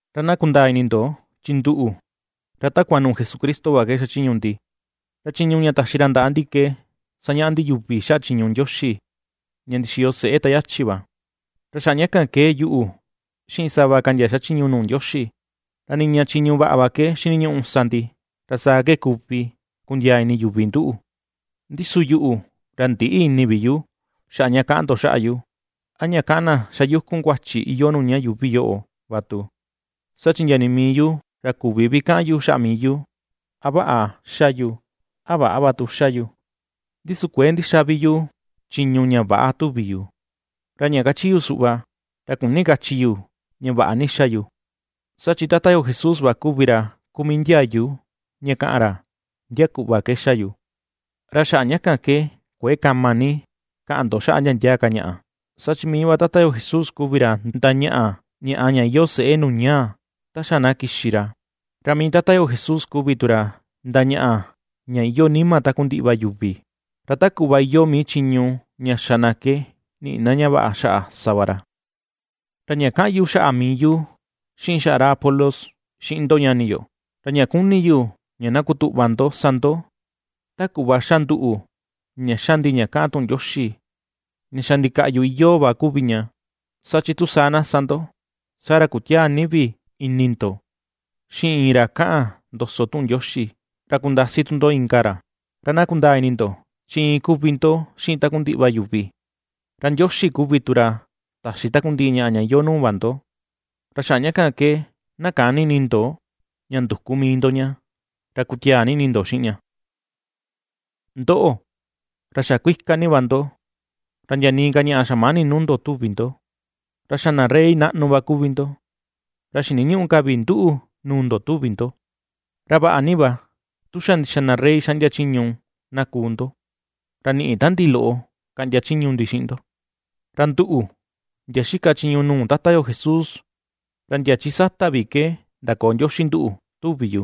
Ra na kundaa ini ndo, chi nduꞌu, ra takua nuu Jesucristo va ke xachiñu ndi, ra chiñu ña taxi ra ndaꞌa ndi ke sañaꞌa ndi yuvi xaꞌa chiñu Ndioxi ña ndixiyo seꞌe ta yachi va. Ra xaꞌa ña kan ke yuꞌu, xiꞌin sava ka ndia xachiñu nuu Ndioxi, ra niña chiñu vaꞌa va ke xiniñuꞌu sa ndi, ra saa ke kuvi kundiaa ini yuvi nduꞌu. Ndi su yuꞌu, ra ndïꞌi ini vi yu, xaꞌa ña kaꞌan ndo xaꞌa yu, a ña kaꞌan na xa yukun kuachi iyoo nuu ña yuuvi yoꞌo va tu, saa chi ndia nii mii yu ra küvi vi kaꞌan yu xaꞌa mii yu a vaꞌa xa yu, a väꞌa va tu xa yu. Ndi su kuëe ndixa vi yu chiñu ña väꞌa tuvi yu, ra ña kachi yu suꞌva, ra küni kachi yu ña vaꞌa ni xa yu. Saa chi Tata yo Jesús va kuvi ra kuu mii ndiayu ña kaꞌan ra ndia kuꞌva ke xa yu. Ra xaꞌa ña kan ke kuëe kama ni na kaꞌan ndo xaꞌa ndia ndia ka ñaꞌa, saa chi mii va Tata yo Jesús kuvi ra ndañaꞌa ñaꞌa ña iyoo seꞌe nuu ñaa, ta xa na kixi ra. Ra mii Tata yo Jesús kuvi tu ra ndañaꞌa ña iyoo nima takundiꞌi va yuvi, ra ta kuꞌva iyoo mii chiñu ña xa na ke niꞌi na ña vaꞌa xaꞌa sa va ra. Ra ña kaꞌan yu xaꞌa mii yu xiꞌin xaꞌa ra Apolos, xiꞌin ndo ñani yo, ra ña ^kuni yu ña na kutuꞌva ndo sa ndo ta kuꞌva ^xa nduꞌu ña xa ndi ña kaꞌan tuꞌun Ndioxi ña xa ndikaꞌyu iyoo va kuvi ña. Saa chi tu saa na sa ndo, saa ra kutiäa ni vi ini ndo xiꞌin iin ra kaꞌan ndoso tuꞌun Ndioxi, ra kundasi tu ndo inka ra. Ra na kundaa ini ndo, chi iin kuvi ndo xiꞌin takundiꞌi va yuvi, ra Ndioxi kuvi tu ra taxi takundiꞌi ñaꞌa ña iyoo nuu va ndo, ra xaꞌa ña kan ke na käni ini ndo ña nduku mii ndo ña, ra kutiaa ni ini ndo xiꞌin ña. Ndoꞌo, ra xa kuika ni va ndo, ra ndia nii ka ñaꞌa xamäni nuu ndo tuvi ndo. Ra xa na rey naꞌnu va kuvi ndo, ra xiniñüꞌu ka vi nduꞌu nuu ndo tuvi ndo. ¡Ra vaꞌa ni vi, tu xa ndixa na rey xaꞌndia chiñu na kuu ndo, ra niꞌi ta ndi loꞌo kaꞌndia ndi chiñu xiꞌin ndo! Ra nduꞌu, ndia ^xika chiñu nuu Tata yo Jesús, ra ndia chi sata va ke ndakoo Ndioxi nduꞌu tuvi yu.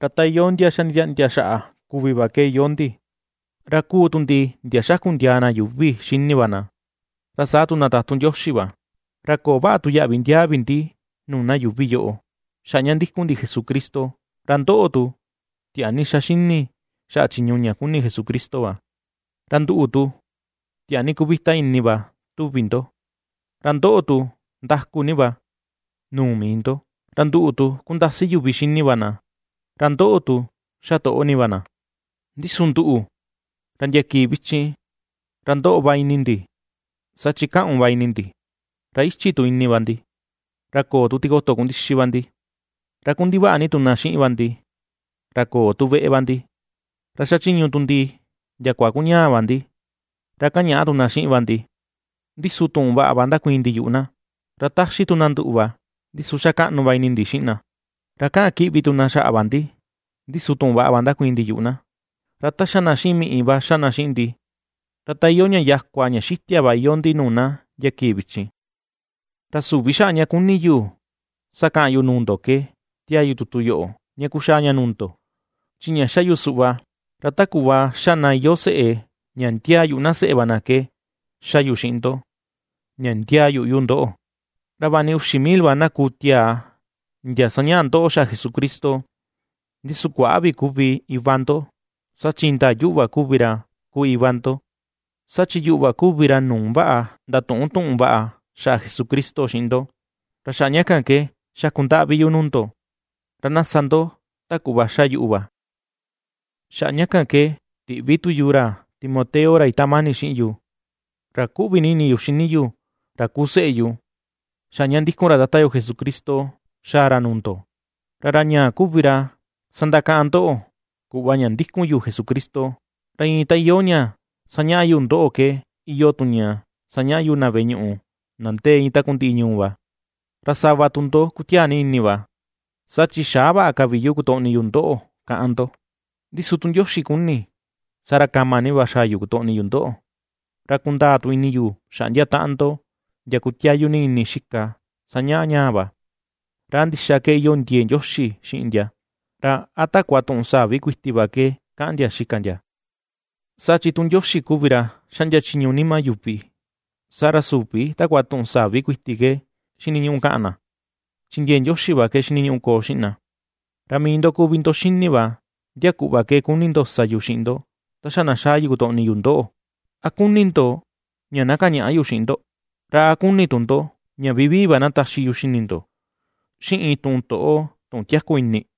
Ra ta iyoo ndia xa nditiaꞌndia xaꞌa kuvi va ke iyoo ndi. Ra kuu tu ndi ndia ^xakundiaa na yuuvi xini va na, ra saa tu na tatun Ndioxi va. Ra köo vaꞌa tu yaꞌvi ndiaa vi ndi nuu na yuuvi yoꞌo xaꞌa ña ^ndíku̱n ndi Jesucristo; ra ndoꞌo tu, tiaa ni ^xa xini xaꞌa chiñu ña kuni Jesucristo va. Ra nduꞌu tu, tiaa ni kuvita ini va tuvi ndo, ra ndoꞌo tu, ndaku ni va, nuu mii ndo. Ra nduꞌu tu, kundasi yuvi xini va na, ra ndoꞌo tu, xa toꞌo ni va na. Ndi su nduꞌu, ra ndia kii vichin ra ^ndoꞌo va ini ndi, saa chi kaꞌun va ini ndi, ra ichi tu ini va ndi, ra köo tu tikoto kundixi va ndi, ra kundivaꞌa ni tu na xiꞌin va ndi, ra köo tu veꞌe va ndi, ra xachiñu tu ndi ndiakua kuñaa va ndi, ra kañaꞌa tu na xiꞌin va ndi, ndi su tuꞌun vaꞌa va ndakuiin ndi yuꞌu na. Ra ^taxi tu na nduꞌu va, ndi su ^xa kaꞌnu va ini ndi xiꞌin na. Ra kaꞌan kiꞌvi tu na xaꞌa va ndi, ndi su tuꞌun vaꞌa va ndakuiin ndi yuꞌu na. Ra ta ^xa na xiꞌin miꞌi va ^xa na xiꞌin ndi, ra ta iyoo ña yakua ña xitia va iyoo ndi nuu na ndia kii vichin. Ra süvi xaꞌa ña ^kuni yu sakaꞌan yu nuu ndo ke tiaa yu tutu yoꞌo ña kuxaa ña nuu ndo, chi ña xa yu suꞌva, ra ta kuꞌva xa na iyoo seꞌe ña ndiaa yuꞌu na seꞌe va na ke, ^xa yu xiꞌin ndo ña ndiaa yuꞌu yu ndoꞌo. Ra vaꞌa ni uxi mil va na kuu tiaa ndia sañaꞌa ndoꞌo xaꞌa Jesucristo, ndi su kuäꞌa vi kuvi iva ndo; saa chi indaa yuꞌu va kuvi ra kuu iva ndo, saa chi yuꞌu va kuvi ra nuu vaꞌa ndatuꞌun tuꞌun vaꞌa xaꞌa Jesucristo xiꞌin ndo. Ra xaꞌa ña kan ke, xaku ndaꞌvi yu nuu ndo, ra na sa ndo ta kuꞌva xa yuꞌu va. Xaꞌa ña kan ke tiꞌvi tu yu ra Timoteo ra itaꞌan mani xiꞌin yu, ra kuꞌvi ni ini yu xini yu, ra kuu seꞌe yu, xaꞌa ña ^ndíku̱n ra Tata yo Jesucristo xaa ra nuu ndo, ra ra ñaa kuvi ra sandakaꞌan ndoꞌo kuꞌva ña ndikun yu Jesucristo, ra iin ta iyoo ña ^sañaꞌa yu ndoꞌo ke iyoo tu ña ^sañaꞌa yu na veꞌe ñuꞌu na ndee iin takundiꞌi ñuu va. Ra sava tu ndo kutiaa ni ini va, saa chi xäa vaꞌa ka vi yu kutoꞌni yu ndoꞌo, káꞌán ndo; ndi su tu Ndioxi kuni, saa ra kama ni va xaa yu kutoꞌni yu ndoꞌo, ra kundaa tu ini yu xaꞌa ndia taꞌan ndo, ndia kutiayu ni ini xika sañaꞌa ñaa va, ra a ndixa ke iyoo ndiee Ndioxi xiꞌin ndia, ra a takua tuꞌun sa̱ví kuiti va ke kaꞌan ndia xika ndia. Saa chi tu Ndioxi kuvi ra xaꞌndia chiñu nima yuvi, saa ra süvi takua tuꞌun sa̱ví kuiti ke xiniñuꞌu kaꞌan na, chi ndiee Ndioxi va ke xiniñuꞌu koo xiꞌin na. Ra mii ndo kuvi ndo xini va ndia kuꞌva ke kuni ndo sa yu xiꞌin ndo ta xa na xaa yu kutoꞌni yu ndoꞌo. ¿A kuni ndo ña na kañaꞌa yu xiꞌin ndo? ¿Ra a kuni tu ndo ña vivii va na taxi yu xini ndo, xiꞌin tuꞌun toꞌo, tuꞌun tiaku ini?